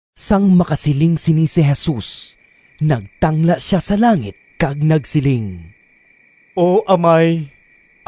Sang makasiling sini si Jesus, nagtangla sia sa langit kag nagsiling, “O Amay,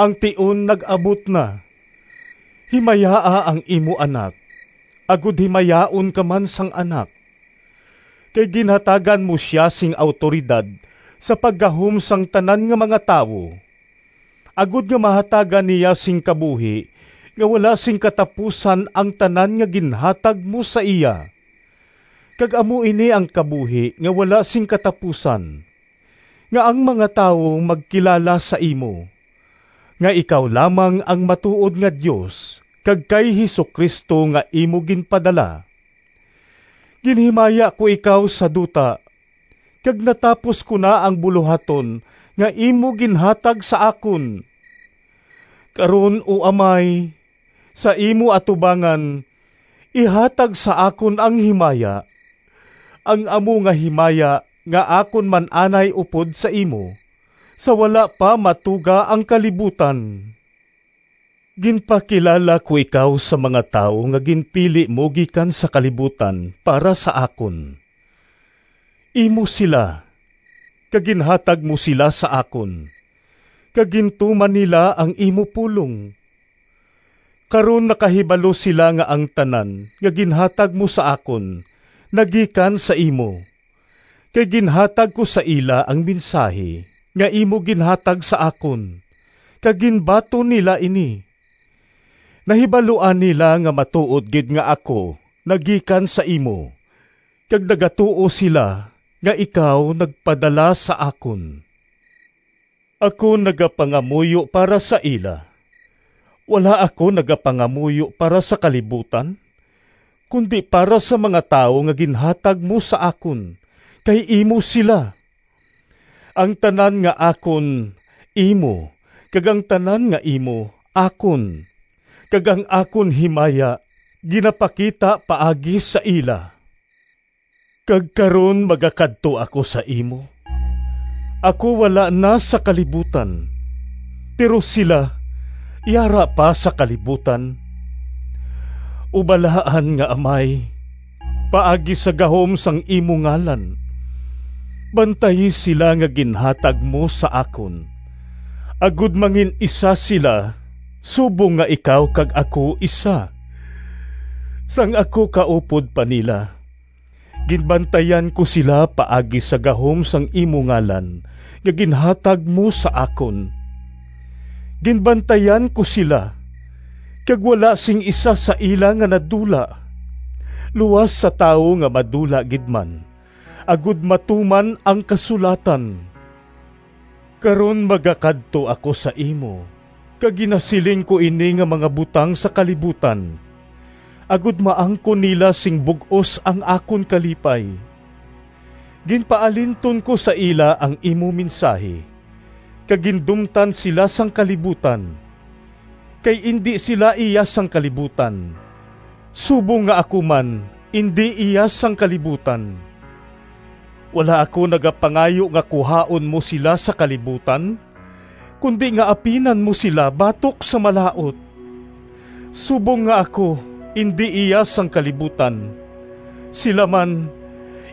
ang tion nag-abot na. Himayaa ang imo Anak, agod himayaon ka man sang Anak. Kay ginhatagan mo sia sing awtoridad sa paggahom sang tanan nga mga tawo, agod nga mahatagan niya sing kabuhi nga wala sing katapusan ang tanan nga ginhatag mo sa iya. Kag amo ini ang kabuhi nga wala sing katapusan, nga ang mga tawo magkilala sa imo, nga ikaw lamang ang matuod nga Dios, kag kay Jesu-Cristo nga imo ginpadala. Ginhimaya ko ikaw sa duta, kag natapos ko na ang bulohaton nga imo ginhatag sa akon. Karon, O Amay, sa imo atubangan ihatag sa akon ang himaya, ang amo nga himaya nga akon man anay upod sa imo sa wala pa matuga ang kalibutan. “Ginpakilala ko ikaw sa mga tawo nga ginpili mo gikan sa kalibutan para sa akon. Imo sila, kag ginhatag mo sila sa akon, kag gintuman nila ang imo pulong. Karon nakahibalo sila nga ang tanan nga ginhatag mo sa akon nagikan sa imo. Kay ginhatag ko sa ila ang mensahi nga imo ginhatag sa akon, kag ginbaton nila ini. Nahibaluan nila nga matuod gid nga ako nagikan sa imo, kag nagatuo sila nga ikaw nagpadala sa akon. “Ako nagapangamuyo para sa ila. Wala ako nagapangamuyo para sa kalibutan, kundi para sa mga tawo nga ginhatag mo sa akon, kay imo sila. Ang tanan nga akon imo kag ang tanan nga imo akon, kag ang akon himaya ginapakita paagi sa ila. Kag karon magakadto ako sa imo; ako wala na sa kalibutan, pero sila yara pa sa kalibutan. O balaan nga Amay! Paagi sa gahom sang imo ngalan bantayi sila nga ginhatag mo sa akon, agod mangin-isa sila subong nga ikaw kag ako isa. Sang ako kaupod pa nila, ginbantayan ko sila paagi sa gahom sang imo ngalan nga ginhatag mo sa akon. Ginbantayan ko sila, kag wala sing isa sa ila nga nadula, luas sa tawo nga madula gid man agod matuman ang kasulatan. Karon magakadto ako sa imo kag ginasiling ko ini nga mga butang sa kalibutan, agod maangkon nila sing bug-os ang akon kalipay. Ginpaalinton ko sa ila ang imo mensahi, kag gindumtan sila sang kalibutan, kay indi sila iya sang kalibutan, subong nga ako man indi iya sang kalibutan. Wala ako nagapangayo nga kuhaon mo sila sa kalibutan, kundi nga apinan mo sila batok sa Malaut. Subong nga ako indi iya sang kalibutan, sila man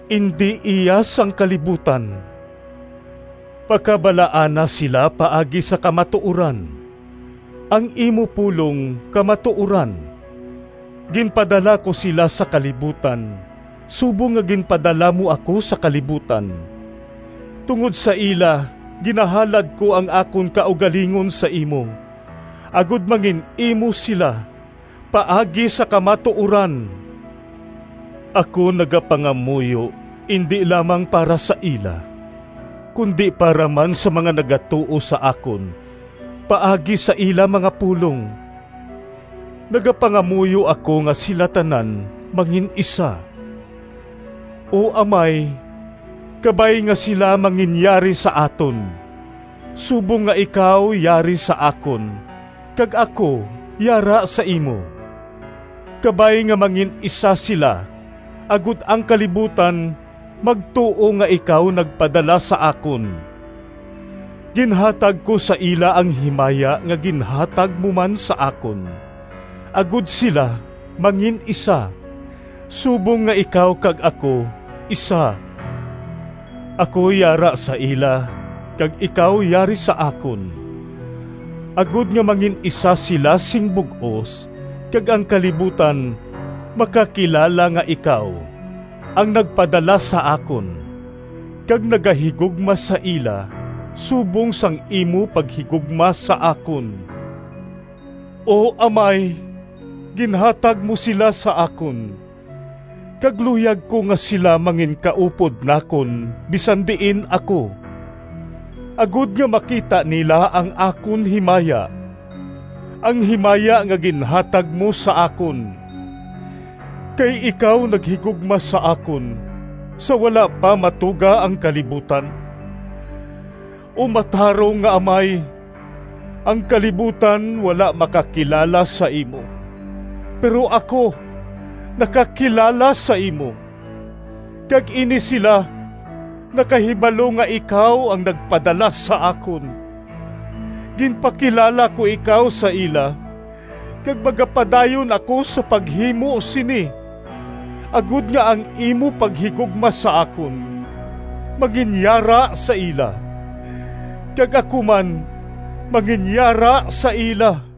indi iya sang kalibutan. Pakabalaana sila paagi sa kamatuoran; ang imo pulong kamatuoran. Ginpadala ko sila sa kalibutan subong nga ginpadala mo ako sa kalibutan. Tungod sa ila ginahalad ko ang akon kaugalingon sa imo, agod mangin-imo sila paagi sa kamatuoran. “Ako nagapangamuyo indi lamang para sa ila, kundi para man sa mga nagatuo sa akon paagi sa ila mga pulong. Nagapangamuyo ako nga sila tanan mangin-isa. O Amay, kabay nga sila manginyari sa aton, subong nga ikaw yari sa akon kag ako yara sa imo. Kabay nga mangin-isa sila, agod ang kalibutan magtuo nga ikaw nagpadala sa akon. Ginhatag ko sa ila ang himaya nga ginhatag mo man sa akon, agod sila mangin-isa, subong nga ikaw kag ako isa. Ako yara sa ila kag ikaw yari sa akon, agod nga mangin-isa sila sing bug-os, kag ang kalibutan makakilala nga ikaw ang nagpadala sa akon kag nagahigugma sa ila subong sang imo paghigugma sa akon. “O Amay, ginhatag mo sila sa akon, kag luyag ko nga sila manginkaupod nakon bisan diin ako, agod nga makita nila ang akon himaya, ang himaya nga ginhatag mo sa akon. Kay ikaw naghigugma sa akon sa wala pa matuga ang kalibutan. O matarong nga Amay, ang kalibutan wala makakilala sa imo, pero ako nakakilala sa imo, kag ini sila nakahibalo nga ikaw ang nagpadala sa akon. Ginpakilala ko ikaw sa ila kag magapadayon ako sa paghimo sini, agod nga ang imo paghigugma sa akon manginyara sa ila, kag ako man manginyara sa ila.”